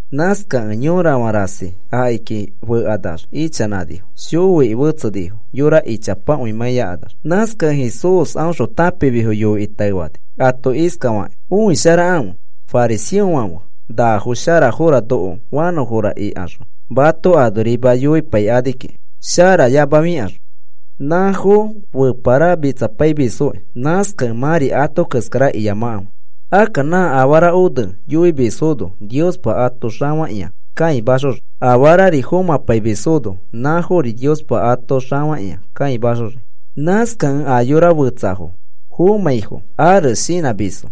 Nãskakẽ yorafã rasi akiki fekanax ichanãnifo. Shoiki fetsenifo yora ichapakõi mãiyakanax. Nãskakẽ Jesús aõxõ tãpimisfo yoikĩ taefani, ato iskafakĩ: “Õisharakãfe fariseofãfe nafo sharafora noko fanõfora ikaxõ mato anorima yoimapaikani kiki sharafoyamafikaxõ. Nãfo feparamitsapaimisfokĩ. Nãskakẽ mãri ato keskara iyamakãfe. “Akka nã afara one yoifimisfono Niospa ato xafakĩa kãimaxoxii, afarari fomãpaimisfono nãfori Niospa ato xafakĩa kãimaxoxii. “Nãskakẽ a yora fetsafo fomãfai ares shinãmisfo,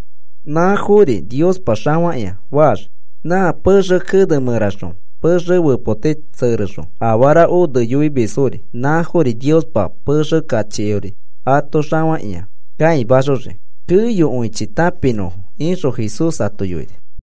nãfori Niospa xafakĩa faxii. Nã pexe kene mẽraxõ pexe fepoti tserexõ afara one yoimisfori, nãfori Niospa pexe kachiori ato xafakĩa kãimaxoxii keyokõichi tãpinõfo,” ixõ Jesús ato yoini.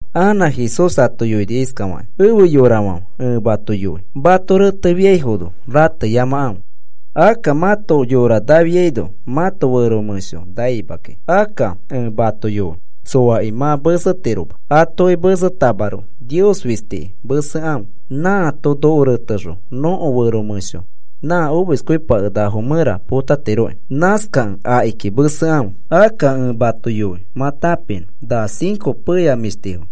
Anã Jesús ato yoini iskafakĩ: “Efe yorafãfe, ẽ mato yoi. Mato retepaifiaifono rateyamakãfe. Akka mãto yora nafiaino mãto fero mẽsho naima kiki. Akka ẽ mato yoi, tsoaki mã mesetiroma, atoki mesetamaroko Nios fistiki mesekãfe. Nãato noko retexõ nõko fero mẽsho nã omiskõipakenakafo mẽra potatiroki. Nãskakẽ akiki mesekãfe. “Akka ẽ mato yoi mã tãpinõ. Na cinco peya mĩshtifo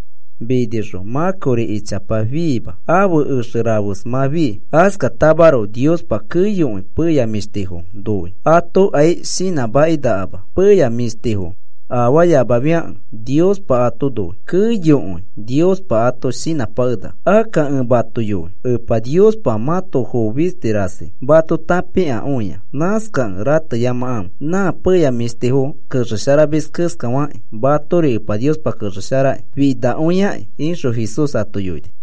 minixõ mã kori ichapa fiima. Ãfe exe rafes mã fii. Askatamaroko Niospa keyokõi peya mĩshtifo noi. Atokai shinãmakĩnakama. Peya mĩshtifo afaamafiakẽ Niospa ato noi. Keyokõi Niospa ato shinãpakenaka. Akka ẽ mato yoi, Epa Niospa mãto foo fisti rasi mato tãpikakõia. Nãskakẽ rateyamakãfe. Nã peya mĩshtifo kexesharamis keskafakĩ matori Epa Niospa kexesharakĩ finakõiakĩ,” ixõ Jesús ato yoini.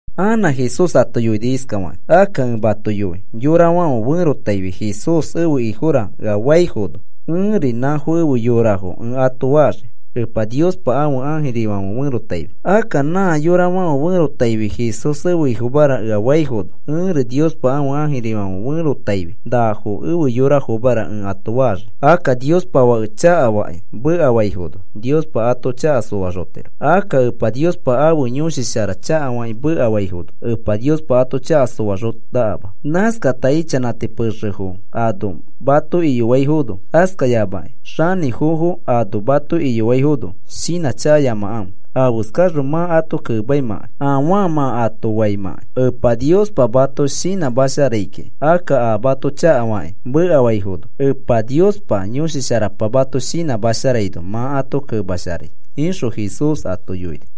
Anã Jesús ato yoini iskafakĩ: “Akka ẽ mato yoi yorafãfe ferotaifi, ‘Jesús ẽfe Ifora,’ ea faifono, ẽri, ‘Nafo efe yorafo,’ ẽ ato faxii Epa Niospa ãfe ãjirifãfe ferotaifi. Akka nã yorafãfe ferotaifi, ‘Jesús ẽfe Ifomara,’ ea faifono, ẽri Niospa ãfe ãjirifãfe ferotaifi, ‘Nafo efe yorafomara,’ ẽ ato faxii. “Akka Niospa Fake chakafakĩ mekafaifono Niospa ato chaka soaxotiro. Akka Epa Niospa ãfe Yõshi Shara chakafakĩ mekafaifono Epa Niospa ato chaka soaxonakama. “Nãskata ichanãti pexefo ano mato iyoaifono, askayamakĩ xanĩfofo ano mato iyoaifono, shinãchakayamakãfe afeskaxõ mã ato kemaimãkai afaa mã ato faimãkai. Epa Niospa mato shinãmasharai kiki. Akka a mato chakafakĩ mekafaifono Epa Niospa Yõshi Sharapa mato shinãmasharaino mã ato kemasharai,” ixõ Jesús ato yoini.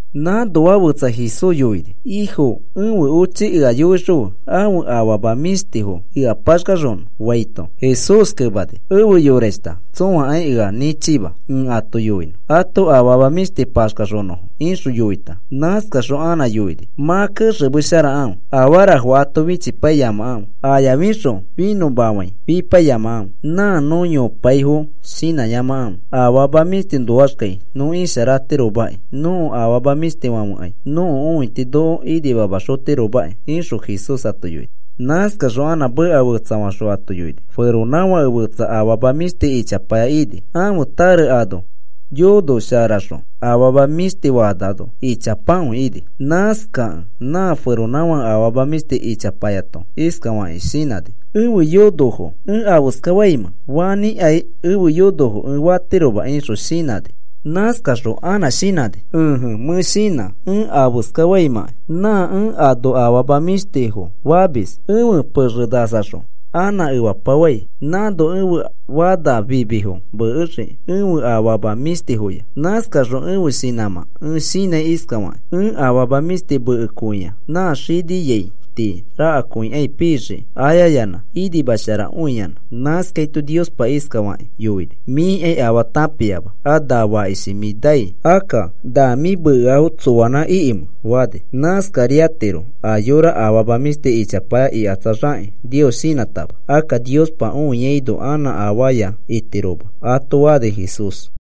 Nãnoa fẽtsa Jesús yoini: “Ifo, ẽfe ochi ea yoixõfe ãfe afama mĩshtifo ea paxkaxonõ,” faito, Jesús kemani: “Efe yorashta, tsõakai ea nĩchima ẽ ato yoinõ ãto afama mĩshti paxkanãnõfo,” ixõ yoita. Nãskaxõ anã yoini: “Mã kexemesharakãfe afarafo ato fichipaiyamakãfe, ayafixõ finõmafãi fipaiyamakãfe. Nã nõ yopaifo shinãyamakãfe, afama mĩshtiõnoaxkai nõ isharatiromaki. Nõko afama mĩshtifãfekai nõko õiti noko inimamaxotiromaki,” ixõ Jesús ato yoini. Nãskaxõ anã meka fetsafaxõ ato yoini: “Feronãfake fetsa afama mĩshti ichapaya ini. Ãfe tare ano yonosharaxõ afama mĩshti fanano ichapakõi ini. Nãskakẽ nã feronãfake afama mĩshti ichapayato iskafakĩ shinãni: ‘¿Ẽfe yonofo ẽ afeskafaimẽ? Fanĩkai ẽfe yonofo ẽ fatiroma,’ ixõ shinãni. Nãskaxõ anã shinãni: ‘Ẽje, mẽ shinã ẽ afeskafaimãkai. Nã ẽ ano afama mĩshtifo famis ẽfe pexe nasaxõ anã efapafai, nãno ẽfe fana fimifo mekexiki ẽfe afama mĩshtifoya. Nãskaxõ ẽfe shinãmã ẽ shinãi iskafakĩ: “Nẽ afama mĩshti mekekõia nã xiniai tii rakakõikai pixiki, ayayanã inimasharakõiyanã.” ’ “Nãskaito Niospa iskafakĩ yoini: ‘Mĩkai afaa tãpiama. A na fakishi mĩ nai, akka, ¿na mĩ mekeafo tsoanã ikimẽ?’ fani. Nãskariatiro a yora afama mĩshti ichapaya ikatsaxakĩ Nios shinãtama. Akka Niospa õiaino anã afaya itiroma,” ato fani Jesús.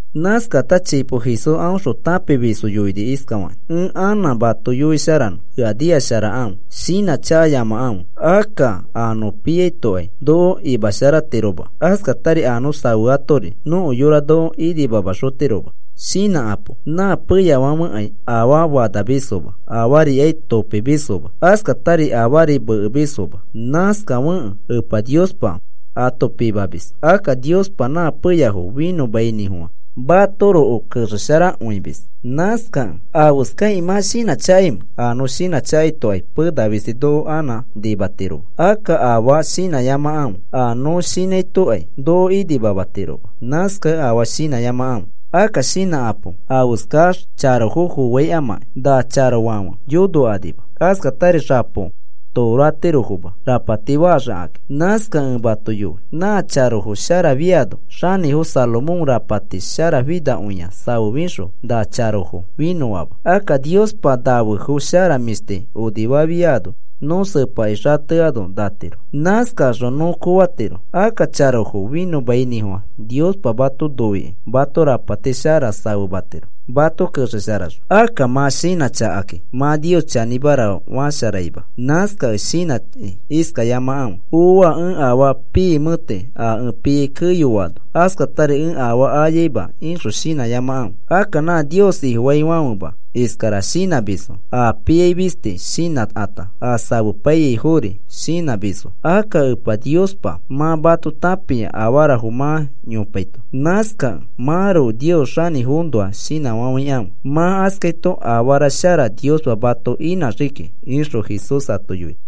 Nãskata chipo Jesús aõxõ tãpimisfo yoini iskafakĩ: “Ẽ anã mato yoisharanõ. Ea nikasharakãfe. Shinãchakayamakãfe. Akka a nõ piaitokai noko imasharatiroma. Askatari a nõ safeatori nõko yora noko imasharaxotiroma. Shinãkapo. Nã peyafãfekai afaa fanamisfoma, afarikai topimisfoma. Askatari afari mekemisfoma. Nãskafekẽ Epa Niospa ato pimamis. Akka Niospa nã peyafo finõmainĩfofã matoroko kexesharakõimis. Nãskakẽ, ¿afeskakĩ mã shinãchakaimẽ? A nõ shinãchakaitokai pena fisti noko anã nimatiroma. Akka afaa shinãyamakãfe. A nõ shinãitokai noko nimatiroma. Nãskakẽ afaa shinãyamakãfe. “Akka shinãkapo afeskax charofo foaikamakĩ. Na charofãfe yonokanima. Askatari xapo toro atirofoma rapati faxikakĩ. Nãskakẽ ẽ mato yoi, na charofo sharafiano xanĩfo Salomón rapati sharafinakõi safefixõ na charofo finõama. Akka Niospa nafefo shara mĩshti onifasharafiano nõ sepakĩ xateano natiro. Nãskaxõ nõ koofatiro. Akka charofo finõmainĩfofã Niospa mato noikĩ mato rapati shara safematiro, mato kexesharaxõ. Akka mã shinãchakakĩ mã Nios chanĩmara fasharaima. Nãskakẽ shinãkĩ iskafayamakãfe: ‘Ooa, ẽ afaa piimẽti a ẽ piai keyoano, askatari ẽ afaa ayaima,’ ixõ shinãyamakãfe. Akka nã Nios Ifofaifãfema iskara shinãmisfo. A piai fisti shinãkata, a safepaiyaifori shinãmisfo. Akka Epa Niospa mã mato tãpia afarafo mã yopaito. Nãskakẽ mãroko Nios xanĩfoõnoa shinãfafãikãfe. Mã askaito afara shara Niospa mato inãxii kiki,” ixõ Jesús ato yoini.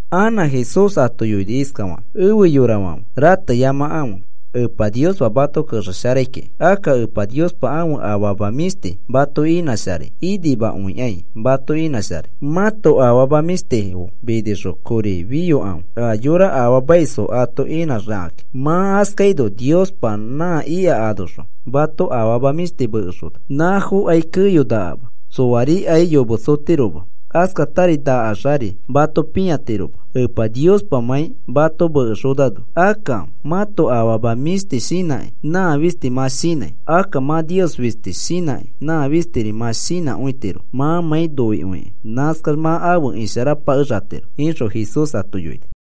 Anã Jesús ato yoini iskafakĩ: “Efe yorafãfe, rateyamakãfe, Epa Niospa mato kexesharaikiki. Akka Epa Niospa ãfe afama mĩshti mato inãsharai inimakõikai mato inãsharai. Mãto afama mĩshtifo minixõ kori fiyokãfe. A yora afaamaisfo ato inãxikakĩ. Mã askaino Niospa nã ika anoxõ mato afama mĩshti mekexona. Nãfokai keyonakama, tsoarikai yometsotiroma. Askatari nakaxari mato pĩatiroma, Epa Niospamãi mato mekexonano. Akka mãto afama mĩshti shinãkĩ nã fisti mã shinãi. Akka mã Nios fisti shinãkĩ nã fistiri mã shinãkõitiro mãmãi noikõikĩ. Nãskax mã afe isharapakexatiro,” ixõ Jesús ato yoini.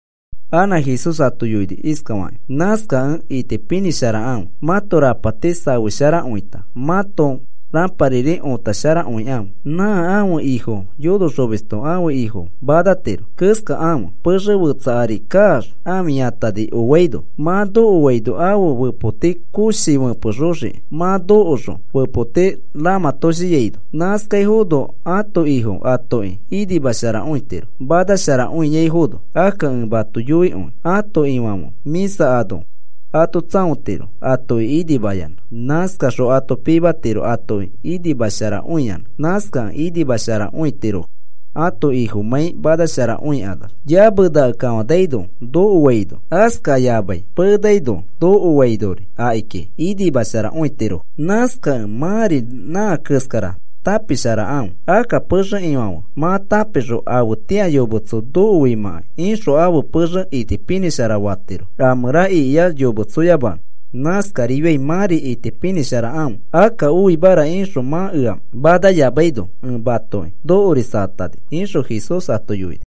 Anã Jesús ato yoini iskafakĩ: “Nãskakẽ itipinĩsharakãfe mãto rapati safesharakõita mãto rãpariri õtasharakõikãfe. Nã ãfe ifo yonoxomisto ãfe ifo manatiro keskakãfe pexe fetsa ari kaax, ãfiyatani oaino. Mã nokoaito ãfe fepoti koshi fepexoxiki, mã nokoxõ fepoti ramãtoshiaino. Nãskaifono ãto ifo atoki inimasharakõitiro, manasharakõiaifono. Akka ẽ mato yoikõi ãto ifãfe mĩsa ano ato tsãotiro atoki inimayanã. Nãskaxõ ato pimatiro atoki inimasharakõiyanã. Nãskakẽ inimasharakõitirofo ãto ifomãi manasharakõikanax, yamenake kafanaino nokoaino, askayamai penanaki kafanaino nokoainori akiki inimasharakõitirofo. Nãskakẽ mãri nã keskara tãpisharakãfe. Akka pexe ifãfe mã tãpixõ afetĩa yometso nokoimãkai ixõ ãfe pexe itipinĩshara fatiro, a mẽra ikiax yometsoyamanõ. Nãskarifiai mãri itipinĩsharakãfe. Akka oimara ixõ mã ea manayamaino ẽ matoki nokorisatani,” ixõ Jesús ato yoini.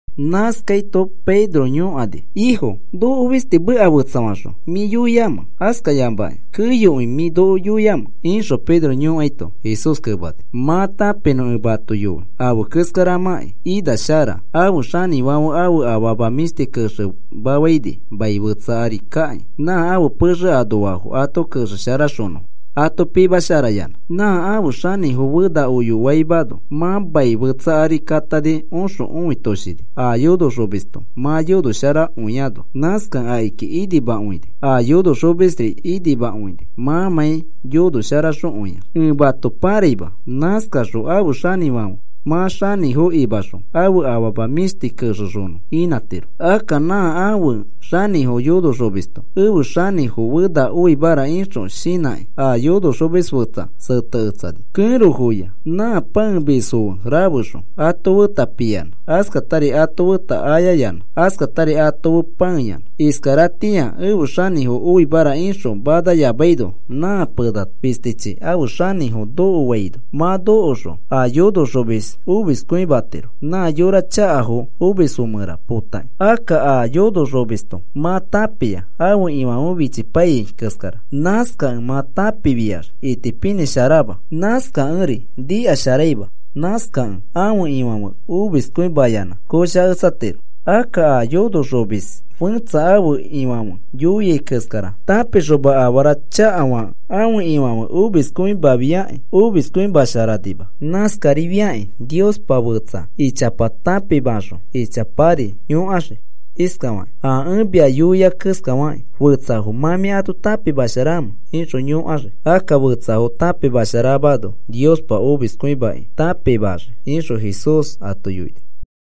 Nãskaito Pedro yõkani: “Ifo, ¿noko fisti meka fetsafaxõ mĩ yoiamẽ, askayamakĩ keyokõi mĩ noko yoiamẽ?” ixõ Pedro yoikaito, Jesús kemani: “Mã tãpinõ ẽ mato yoi afe keskaramãkĩ ina shara ãfe xanĩfãfe ãfe afama mĩshti kexemafaini mai fetsa ari kakĩ nã ãfe pexe anoafo ato kexesharaxonõ ato pimasharayanã, nã ãfe xanĩfo fena oyamaino. Mã mai fetsa ari katani oxõ õitoshini a yonoxomisto mã yonoxosharakõiano. Nãskakẽ akiki inimakõini a yonoxomisri inimakõini mãmãi yonoxosharakõiax. Ẽ mato pãraima. Nãskaxõ ãfe xanĩfãfe mã xanĩfo imaxõ ãfe afama mĩshti kexexonõ inãtiro. Akka nã ãfe xanĩfo yonoxomisto, ‘Ẽfe xanĩfo fena oimara,’ ixõ shinãkĩ, a yonoxomis fetsafo sẽteketsani, kẽrofoya. Nã pãemisfo fe rafexõ ato feta piyanã, askatari ato feta ayayanã, askatari ato fe pãeyanã. Iskaratĩa ẽfe xanĩfo oimara ixõ manayamaino, nã pena fistichi ãfe xanĩfo nokofiaino mã nokoxõ a yonoxomis omiskõimatiro, nã yora chakafo fomisfo mẽra potakĩ. “Akka a yonoxomisto mã tãpia ãfe ifãfe fichipaiyai keskara, nãskakẽ mã tãpifiax itipinĩsharama, nãskakẽri nikasharaima, nãskakẽ ãfe ifãfe omiskõimayanã koshaketsatiro. Akka a yonoxomis fẽtsa ãfe ifãfe yoia keskara tãpixoma afara chakafakẽ ãfe ifãfe omiskõimafiakĩ, omiskõimasharanima. Nãskarifiakĩ Niospa fetsa ichapa tãpimaxõ ichapari yõkaxii. Iskafakĩ a ẽ mia yoia keskafakĩ, ¿fetsafo mã mĩ ato tãpimasharamẽ? ixõ yõkaxii. Akka fetsafo tãpimasharamano Niospa omiskõimakĩ tãpimaxii,” ixõ Jesús ato yoini.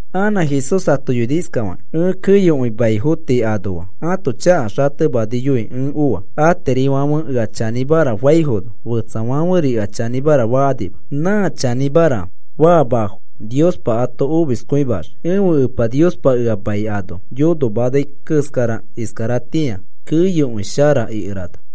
Anã Jesús ato yoini iskafakĩ: “Ẽ keyokõi maifo tii anoa ãto chaka xatemaniyoi ẽ oa. Atirifãfe ea chanĩmara faifono, fetsafãferi ea chanĩmara fakanima. Nã chanĩmara faamafo Niospa ato omiskõimaxii. Ẽfe Epa Niospa ea mai ano yonomanai keskara iskaratĩa keyokõi shara ikerana.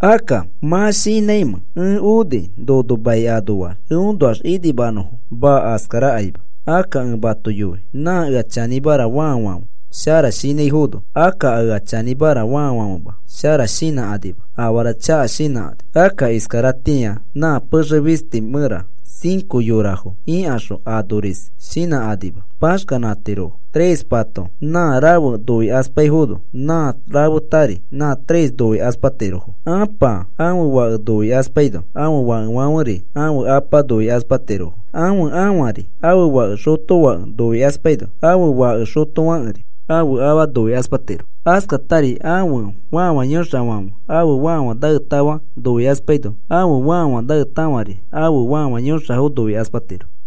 Akka, ¿mã shinãimẽ ẽ oni nono mai anoax eõnoax inimanõfo? Maa. Askarakaima. Akka ẽ mato yoi nã ea chanĩmara faafãfe shara shinãifono, akka a ea chanĩmara faafãfema shara shinãkanima, afara chaka shinãkani. Akka iskaratĩa nã pexe fisti mẽra cinco yorafo ikaxõ anorisfo shinãkanima, paxkanãtirofo. Trespato nã rafe noikaspaifono, nã rafetari nã tres noikaspatirofo. Apa ãfe fake noikaspaino ãfe fakefãferi ãfe apa noikaspatiro. Ãfe ãfari ãfe fake xotofake noikaspaino ãfe fake xotofãkeri ãfe afa noikaspatiro. Askatari ãfe fãfa yõxafãfe ãfe fãfa naetafa noikaspaino ãfe fãfa naetafari ãfe fãfa yõxafo noikaspatiro.”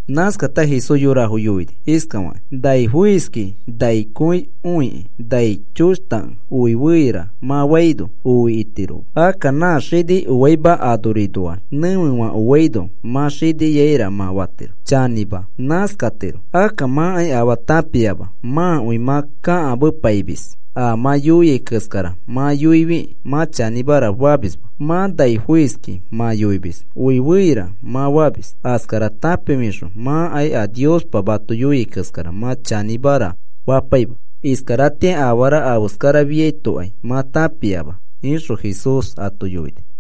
Nãskata Jesús yorafo yoini iskafakĩ: “Nai foiski nai kõi õikĩ nai choshtakẽ oi feira mã faino oi itiro. Akka nã xini oaima anorinoax nẽfefã oaino, mã xiniaira mã fatiro. Chanĩma, nãskatiro. Akka mãkai afaa tãpiama, mãkõi mã kakamepaimis a mã yoiai keskara mã yoifikĩ mã chanĩmara famisma. Mã nai foiskĩ mã yoimis oi feira mã famis. Askara tãpifixõ mãkai a Niospa mato yoiai keskara mã chanĩmara fapaima. Iskaratĩa afara afeskarafiaitokai mã tãpiama,” ixõ Jesús ato yoini.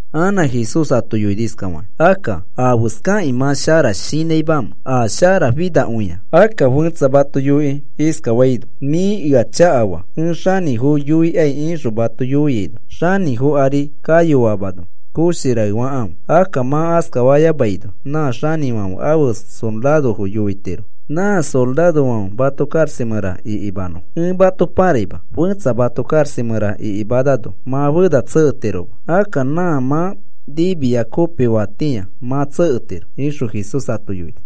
Anã Jesús ato yoini iskafakĩ: “Akka, ¿afeskakĩ mã shara shinãimamẽ a sharafinakõia? Akka fẽtsa mato yoikĩ iskafaino: ‘Mĩ ea chakafaa. Ẽ xanĩfo yoikai,’ ixõ mato yoiaino, xanĩfo ari kayoamano koshi raefakãfe. Akka mã askafayamaino nã xanĩfãfe ãfe sorarofo yoitiro nã sorarofãfe mato karaxa mẽra ikimanõfo. Ẽ mato paraima. Fẽtsa mato karaxa mẽra ikimanano mã fena tseketiroma. Akka nã mã nimia kopifatĩa mã tseketiro,” ixõ Jesús ato yoini.